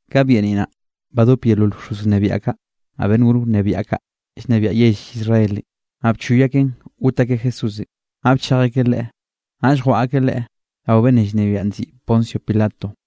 Ka byeniꞌ naꞌ, badope yeolol bxoz wnebiaꞌ kaꞌ, naꞌ beꞌnn gor wnebiaꞌ kaꞌ llnebiaꞌ yell Israelenꞌ, naꞌ bchoy akeꞌn got akeꞌ Jesúsenꞌ. Naꞌ bchej akeꞌ Leꞌe, naꞌll jwaꞌa akeꞌ Leꞌe rao beꞌnnenꞌ llnebiaꞌn nziꞌi Poncio Pilato.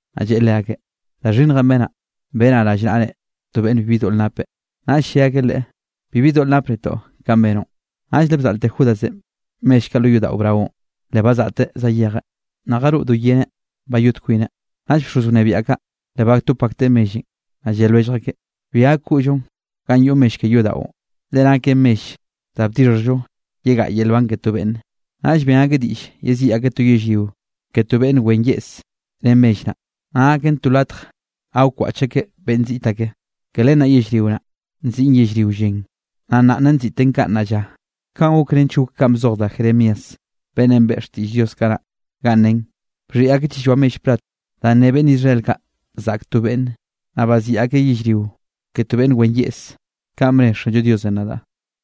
Naꞌ lleꞌe leakeꞌ: —Da xhinnjenꞌ benaꞌ, benaꞌ rallnaꞌre to beꞌnn bibi doꞌl napeꞌ. Naꞌll lle akeꞌ leꞌe: —Bibi doꞌl nap netoꞌ kanꞌ benoꞌn. Naꞌll le bzaꞌlte Judasenꞌ mell kaꞌ lo yodaꞌo braonꞌ, le bazaꞌteꞌ zayejeꞌ, naꞌ jaroꞌ do yeneꞌ bayot kwineꞌ. Naꞌll bxoz wnebiaꞌ kaꞌ le batop akteꞌ mellenꞌ, naꞌll lle lwellj akeꞌ: —Bi gak koꞌllonꞌ ganꞌ yoꞌ mell ke yodaꞌon, le naken mell danꞌ bdixhjllo yegaꞌa yel nban ke to beꞌnne. Naꞌll ben akeꞌ diꞌll yeziꞌi akeꞌ to yellrio ke to beꞌnn wen yeꞌse ren mell naꞌ, naꞌ gaken to latj ga wkwaꞌch akeꞌ beꞌnn ziꞌt ake. Ke len naꞌ yellrio naꞌ, nziꞌi Yellrio Llen, naꞌ nna nziꞌten kaꞌ nnaꞌ lla. Kanꞌ gok nench gok kanꞌ bzoj da Jeremías, beꞌnnenꞌ beꞌe xtiꞌll Diosenꞌ kanaꞌ, ganꞌ nen: “Bxhiꞌi akeꞌ chilloa mell plat, danꞌ ne beꞌnn Israel kaꞌ, zaꞌk to beꞌnne. Naꞌ baziꞌi akeꞌ yellrio ke to beꞌnn wen yeꞌse, kanꞌ bne Xanllo Diosenꞌ nadaꞌ.”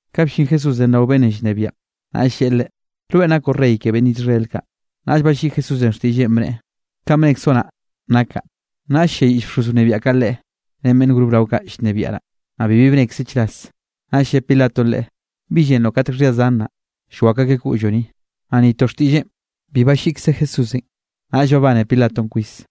Ka bllin Jesúsenꞌ rao beꞌnnenꞌ llnebiaꞌn, naꞌll lleꞌe Leꞌe: —¿Rweꞌn nakoꞌ rey ke beꞌnn Israel kaꞌ? Naꞌll balliꞌi Jesúsenꞌ xtiꞌlleꞌn, bneꞌe: —Kanꞌ bnekzoꞌ naꞌ nakaꞌ. Naꞌll ll-lliayiꞌll bxoz wnebiaꞌ kaꞌ Leꞌe, ren beꞌnn gor brao kaꞌ llnebiaꞌ naꞌ. Naꞌ bibi bnekzeꞌ chras. Naꞌll lle Pilatonꞌ Leꞌe: —¿Bi llenroꞌ katek xhia zan naꞌ, llwakw akeꞌ koꞌlloꞌ ni? Naꞌ ni to xtiꞌlleꞌn bi balliꞌkze Jesúsenꞌ, naꞌll babane Pilatonꞌ kwis.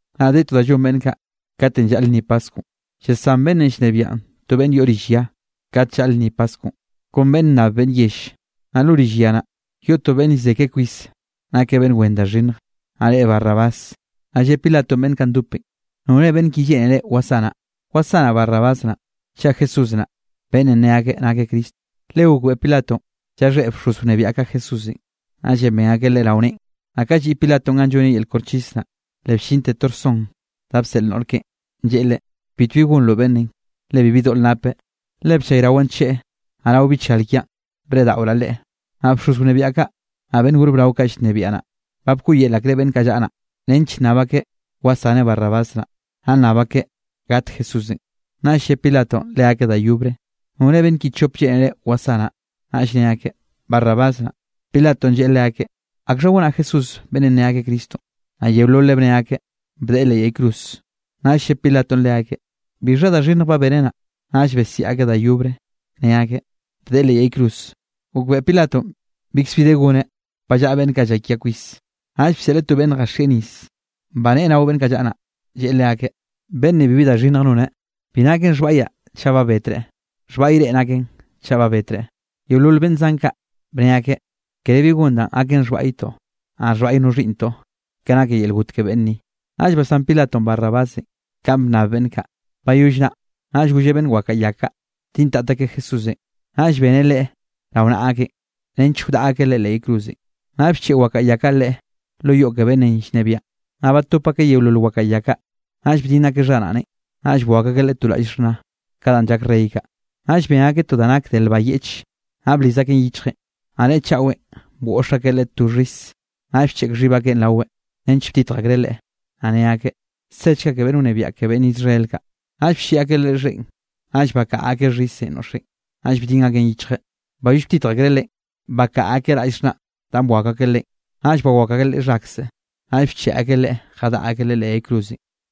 Naꞌ de to da llon beꞌnn kaꞌ, katenꞌ llaꞌl lnni paskwnꞌ, yesán beꞌnnenꞌ llnebiaꞌn to beꞌnn yoꞌ rill ya, kat llaꞌl lnni Paskwnꞌ, kon beꞌnn nnab beꞌnn yell. Naꞌ lo rill ya naꞌ, yoꞌ to beꞌnne llze ke kwis, nakeꞌ beꞌnn wen da xhinnj, naꞌ reꞌe Barrabás. Naꞌ lle Pilatonꞌ beꞌnn kaꞌ ndopenꞌ: —¿Nore beꞌnn ki lleꞌnere wasanaꞌ? ¿Wasanaꞌ Barrabás naꞌ, chaꞌ Jesús naꞌ, beꞌnnenꞌ ne akeꞌ nakeꞌ Cristo? Le gokbeꞌe Pilatonꞌ llaxhéꞌ bxoz wnebiaꞌ kaꞌ Jesúsenꞌ, naꞌllenꞌ ben akeꞌ Leꞌe rao neꞌen. Naꞌ ka lliꞌ Pilatonꞌ ganꞌ lloneꞌ yel koxchis naꞌ, le bllinte to rson da bseꞌl noꞌr keꞌen, lleꞌe leꞌe: “Bitbi gonroꞌ beꞌnnenꞌ, le bibi doꞌl napeꞌ. Le bllayrawaꞌ ncheꞌe, naꞌ rao bichgal kiaꞌn breꞌdaꞌoraꞌ Leꞌe.” Naꞌ bxoz wnebiaꞌ kaꞌ, naꞌ beꞌnn gor brao kaꞌ llnebiaꞌ naꞌ, ba bkoꞌyel akreꞌ beꞌnn kaꞌ llaꞌa naꞌ, nench nnab akeꞌ wsaneꞌ Barrabás naꞌ, naꞌ nnab akeꞌ gat Jesúsenꞌ. Naꞌll lle Pilatonꞌ leakeꞌ da yobre: —¿Nore beꞌnn ki chop lleꞌnere wasanaꞌ? Naꞌll ne akeꞌ: —Barrabás naꞌ. Pilatonꞌ lleꞌe leakeꞌ: —¿Akxha gonaꞌ Jesúsenꞌ beꞌnnenꞌ ne akeꞌ Cristonꞌ? Naꞌ yeololeꞌ bne akeꞌ: —¡Bdeꞌe leꞌ yay cruz! Naꞌll lle Pilatonꞌ leakeꞌ: —¿Bixha da xhinnj ba beneꞌ naꞌ? Naꞌll besiaꞌ akeꞌ da yobre ne akeꞌ: —¡Bdeꞌe leꞌ yay cruz! Gokbeꞌe Pilatonꞌ bikzbi de goneꞌ. Ba llaꞌa beꞌnn kaꞌ llakia kwis, naꞌll bseꞌleꞌ to beꞌnn jaxieꞌ nis, baneꞌe rao beꞌnn kaꞌ llaꞌa naꞌ, lleꞌe leakeꞌ: —Beꞌnn ni bibi da xhinnj noneꞌ. Bi naken xhbaꞌyaꞌ chaꞌ ba betreꞌ, xhbaꞌy reꞌ naken chaꞌ ba betreꞌ. Yeolol beꞌnn zan kaꞌ bne akeꞌ: —Kere bi gon danꞌ gaken xhbaꞌytoꞌ, naꞌ xhbaꞌy no xhiꞌnntoꞌ ke nake yel got ke beꞌnn ni. Naꞌll basán Pilatonꞌ Barrabásenꞌ kanꞌ bnnab beꞌnn kaꞌ. Bayoll naꞌ, naꞌll golleꞌ beꞌnn wakaꞌa ya kaꞌ, bdintat akeꞌ Jesúsenꞌ, naꞌll beneꞌ Leꞌe rao naꞌa akeꞌn, nench wdaꞌa akeꞌ Leꞌe leꞌ yay cruzenꞌ. Naꞌll bcheꞌe wakaꞌa ya kaꞌ Leꞌe lo yoꞌ ke beꞌnnenꞌ llnebiaꞌn, naꞌ batop akeꞌ yeolol wakaꞌa ya kaꞌ. Naꞌll bdinn akeꞌ xharaꞌneꞌn, naꞌ bwakw akeꞌ Leꞌe to raꞌll xhna, ka danꞌ llak rey kaꞌ. Naꞌll ben akeꞌ to da nak de lba yeꞌche, naꞌ bliz akeꞌn yichjeꞌn, naꞌ neꞌe chaꞌwenꞌ bgoꞌx akeꞌ Leꞌe to xhis. Naꞌll bcheꞌk xhib akeꞌ raweꞌn, nench btitj akreꞌ Leꞌe, naꞌ ne akeꞌ: —¡Sechga ke beꞌnn wnebiaꞌ ke beꞌnn Israel kaꞌ! Naꞌll blliꞌ akeꞌ Leꞌe xheꞌn, naꞌll bakaꞌa akeꞌ xhisenꞌ noꞌxeꞌn, naꞌll bdin akeꞌn yichjeꞌ. Bayoll btitj akreꞌ Leꞌen, bakaꞌa akeꞌ raꞌll xhnanꞌ danꞌ bwakw akeꞌ Leꞌen, naꞌll bawakw akeꞌ Leꞌe xhakzeꞌ. Naꞌll bcheꞌe akeꞌ Leꞌe jadaꞌa akeꞌ Leꞌe leꞌ yay cruz.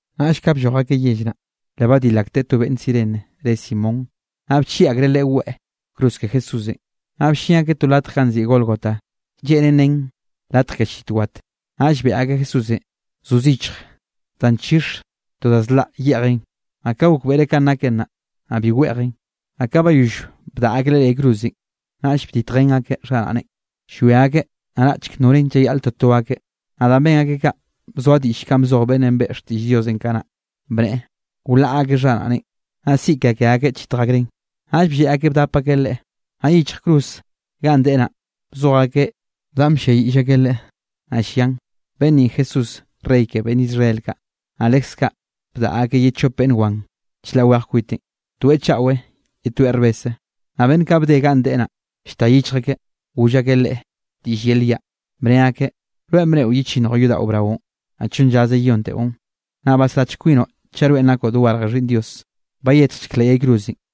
Naꞌll ka blloj akeꞌ yell naꞌ, le badil akteꞌ to beꞌnn Cirene re Simón, naꞌ bchieꞌ akreꞌ leꞌe weꞌe cruz ke Jesúsenꞌ. Naꞌ bllin akeꞌ to latj ganꞌ nziꞌi Gólgota, lleꞌnen nen latj ke llit wat. Naꞌll beꞌe akeꞌ Jesúsenꞌ zo zichj da nchixe to da zlaꞌ yeꞌjeꞌn, naꞌ ka gokbeꞌreꞌ kanꞌ naken naꞌ, naꞌ bi weꞌjeꞌn. Naꞌ ka bayoll bdaꞌa akeꞌ Leꞌe leꞌ yay cruzenꞌ, naꞌll bditjen akeꞌ xharaꞌneꞌn, llwia akeꞌ naraꞌchk norenꞌ llayaꞌl toto akeꞌ. Naꞌ danꞌ ben akeꞌ kaꞌ, bzoa diꞌll kanꞌ bzoj beꞌnnenꞌ beꞌe xtiꞌll Diosenꞌ kanaꞌ, bneꞌe: “Wlaꞌa akeꞌ xharaꞌneꞌn, naꞌ siꞌi ke ke akeꞌ chitje akreꞌn.” Naꞌll blleꞌ akeꞌ bdap akeꞌ Leꞌe. Naꞌ yichj cruzenꞌ ganꞌ deꞌe naꞌ, bzoj akeꞌ danꞌ blliayiꞌll akeꞌ Leꞌe, naꞌ llian: “Beꞌnn ni Jesúsenꞌ rey ke beꞌnn Israel kaꞌ.” Naꞌ lekze kaꞌ, bdaꞌa akeꞌ ye chop beꞌnn wan chlaꞌ weje kwiteꞌn, toeꞌ chaꞌwe ye toeꞌ rbese. Naꞌ beꞌnn kaꞌ bde ganꞌ deꞌe naꞌ, llta yichj akeꞌ goll akeꞌ Leꞌe diꞌll yel yaꞌ, bne akeꞌ: —Rweꞌn bneꞌo yechinnjoꞌ yodaꞌo braonꞌ, naꞌ chonn llaze yeyonteꞌon. Naꞌ basrachk kwinoꞌ chaꞌ rweꞌn nakoꞌ dogarje Xhiꞌnn Dios, bayetjchek leꞌ yay cruzenꞌ.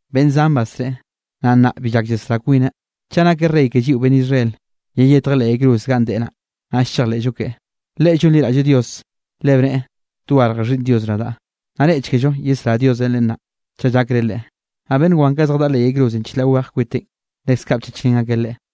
—¡Beꞌnn zan basreꞌe, naꞌ nnaꞌ bi llak yesrá kwineꞌ! Chaꞌ nakeꞌ rey ke lliꞌo beꞌnn Israel, yeyetjeꞌ leꞌ yay cruz ganꞌ deꞌe naꞌ, naꞌll chejleꞌllo keꞌe. Leꞌe llonliraꞌlleꞌ Dios, le bneꞌe: “Dogarje Xhiꞌnn Dios nadaꞌ.” ¡Naꞌ reꞌchekello yesrá Diosenꞌ Leꞌe nnaꞌ, chaꞌ llakreꞌ Leꞌe! Naꞌ beꞌnn wan kaꞌ zjadaꞌa leꞌ yay cruzenꞌ chlaꞌ weje kwiteꞌn, leskaꞌ bchachrén akeꞌ Leꞌe.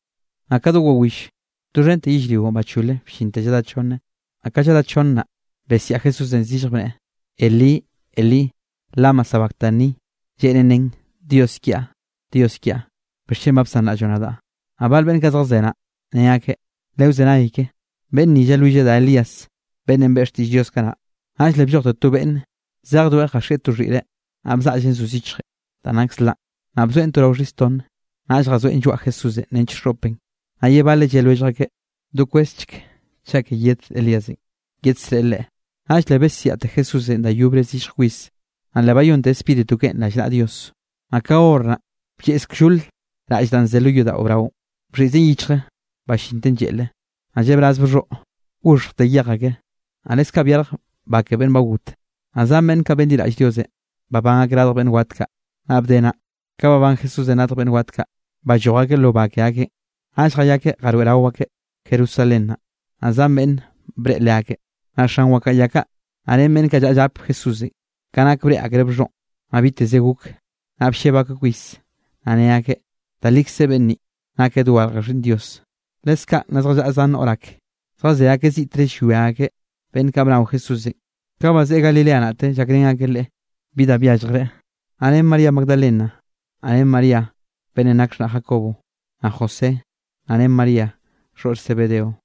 Naꞌ ka do wawill, doxhente yellrionꞌ bachole bllinte lladá chonne. Naꞌ ka lladá chonne naꞌ, besiaꞌ Jesúsenꞌ zillje bneꞌe: —Elí Elí, ¿lama sabactani? (Lleꞌnen nen: Dios kiaꞌ, Dios kiaꞌ, ¿bixchen ba bsanraꞌlloꞌ nadaꞌ?) Naꞌ bal beꞌnn kaꞌ zjazé naꞌ, ne akeꞌ: —Lewzenay keꞌe, beꞌnn ni llalwilleꞌ da Elías beꞌnnenꞌ beꞌe xtiꞌll Dios kanaꞌ. Naꞌll le bllojte to beꞌnn zejdoeꞌ jaxieꞌ to xhiꞌre, naꞌ bzaꞌlleꞌn zo zichjenꞌ da nak zlaꞌn, naꞌ bzoeꞌn to rao xhis tonne, naꞌll jazoeꞌn lloaꞌ Jesúsenꞌ nench xoꞌpeꞌn. Naꞌ ye baleꞌ lle lwellj akeꞌ: —Dokwezchek, chaꞌ ke yed Elíasenꞌ yedsreꞌe Leꞌe. Naꞌll le besiaꞌte Jesúsenꞌ da yobre zillj kwis, naꞌ le bayonteꞌ spíritu keꞌen rallnaꞌa Dios. Naꞌ ka hor naꞌ, blleꞌz kllole raꞌll danꞌ ze lo yodaꞌo braonꞌ, bxhiꞌzen yichje ballinte lleꞌle, naꞌ llebraz bxhoꞌ, goxhjte yej ake. Naꞌ leskaꞌ byarj ba ke beꞌnn ba got. Naꞌ zan beꞌnn kaꞌ benliraꞌll Diosenꞌ, babán akeꞌ radj beꞌnn wat kaꞌ. Naꞌ bde naꞌ, ka babán Jesúsenꞌ radj beꞌnn wat kaꞌ, balloj akeꞌ lo ba ke akeꞌn, naꞌll jayakeꞌ jaroeꞌrao akeꞌ Jerusalén. Naꞌ zan beꞌnn breꞌe leakeꞌ. Naꞌ xan wakaꞌa ya kaꞌ, naꞌ ren beꞌnn kaꞌ llaꞌa llap Jesúsenꞌ, ka nak breꞌe akreꞌ bxhoꞌn, naꞌ biteze gok, naꞌ blleb akeꞌ kwis, naꞌ ne akeꞌ: —Da likze beꞌnn ni, nakeꞌ dogarj Xhiꞌnn Dios. Leskaꞌ naꞌ zjallaꞌa zan noꞌr ak, zjazé akeꞌ ziꞌtre llwia akeꞌ. Beꞌnn kaꞌ bnao Jesúsenꞌ, ka bazeꞌe Galilea naꞌte llakrén akeꞌ Leꞌe bi da byalljreꞌ. Naꞌ ren María Magdalena, naꞌ ren María beꞌnnenꞌ nak xhnaꞌ Jacobo, naꞌ José, naꞌ ren María xhoꞌr Zebedeo.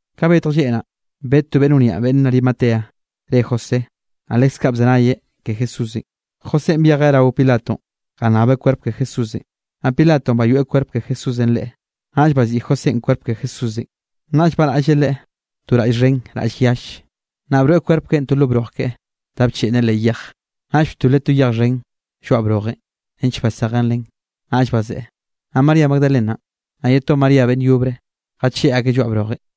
Ka betj lleꞌ naꞌ, bed to beꞌnn wniaꞌ beꞌnn Arimatea re José, naꞌ leskaꞌ bzenayeꞌ ke Jesúsenꞌ. Josénꞌ byejeꞌ rao Pilatonꞌ jannabeꞌ kwerp ke Jesúsenꞌ, naꞌ Pilatonꞌ bayoeꞌ kwerp ke Jesúsenꞌ leꞌe. Naꞌll baziꞌi Josénꞌ kwerp ke Jesúsenꞌ, naꞌll baraꞌlleꞌ Leꞌe to raꞌll xhen raꞌll yalle. Naꞌ broeꞌ kwerp keꞌen to lo broj keꞌe, da bcheꞌnneꞌ leꞌ yej. Naꞌll btoleꞌ to yej xhen lloaꞌ brojenꞌ, nench basejen len, naꞌll bazeꞌe. Naꞌ María Magdalenanꞌ, naꞌ ye to María beꞌnn yobre, jacheꞌ akeꞌ lloaꞌ brojenꞌ.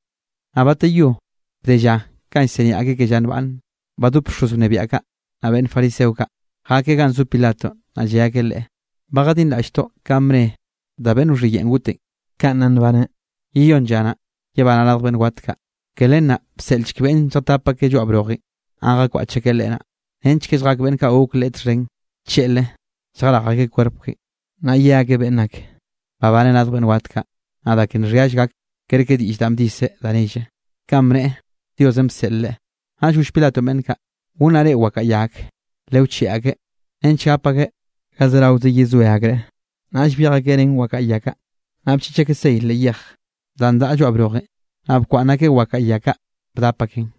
Naꞌ bateyó, bde lla kanꞌ llsiniaꞌ akeꞌ ke lla nbaꞌnn, badop bxoz wnebiaꞌ kaꞌ, naꞌ beꞌnn fariseo kaꞌ jakeꞌ ganꞌ zo Pilatonꞌ. Naꞌ lle akeꞌ leꞌe: —Ba jadinraꞌlltoꞌ kanꞌ bne da beꞌnn wxhiyeꞌn gotenꞌ, kanꞌ nna nbaneꞌ: “Yeyónn lla naꞌ, yebanaꞌ radj beꞌnn wat kaꞌ.” Ke len naꞌ bseꞌlchek beꞌnn lljatap akeꞌ lloaꞌ brojenꞌ ganꞌ jakwaꞌch akeꞌ Leꞌe naꞌ, nench ke lljak beꞌnn kaꞌ gok leꞌe txhen tlleꞌlre lljarej akeꞌ kwerp keꞌen, naꞌ ye akeꞌ beꞌnn ak, babaneꞌ radj beꞌnn wat kaꞌ, naꞌ da ke nxhiall gak, kerke diꞌll danꞌ bdise da nell, kanꞌ bneꞌe Diosenꞌ bseꞌle Leꞌe. Naꞌll goll Pilatonꞌ beꞌnn kaꞌ: —Gonnaꞌ reꞌ wakaꞌa ya ak, lewcheꞌe akeꞌ nench gap akeꞌ ga zeraoze yezoe akreꞌ. Naꞌll byej akeꞌ ren wakaꞌa ya kaꞌ, naꞌ bchiꞌch akeꞌ sey leꞌ yej, danꞌ daꞌa lloaꞌ brojenꞌ, naꞌ bkwaꞌnn akeꞌ wakaꞌa ya kaꞌ bdap akeꞌn.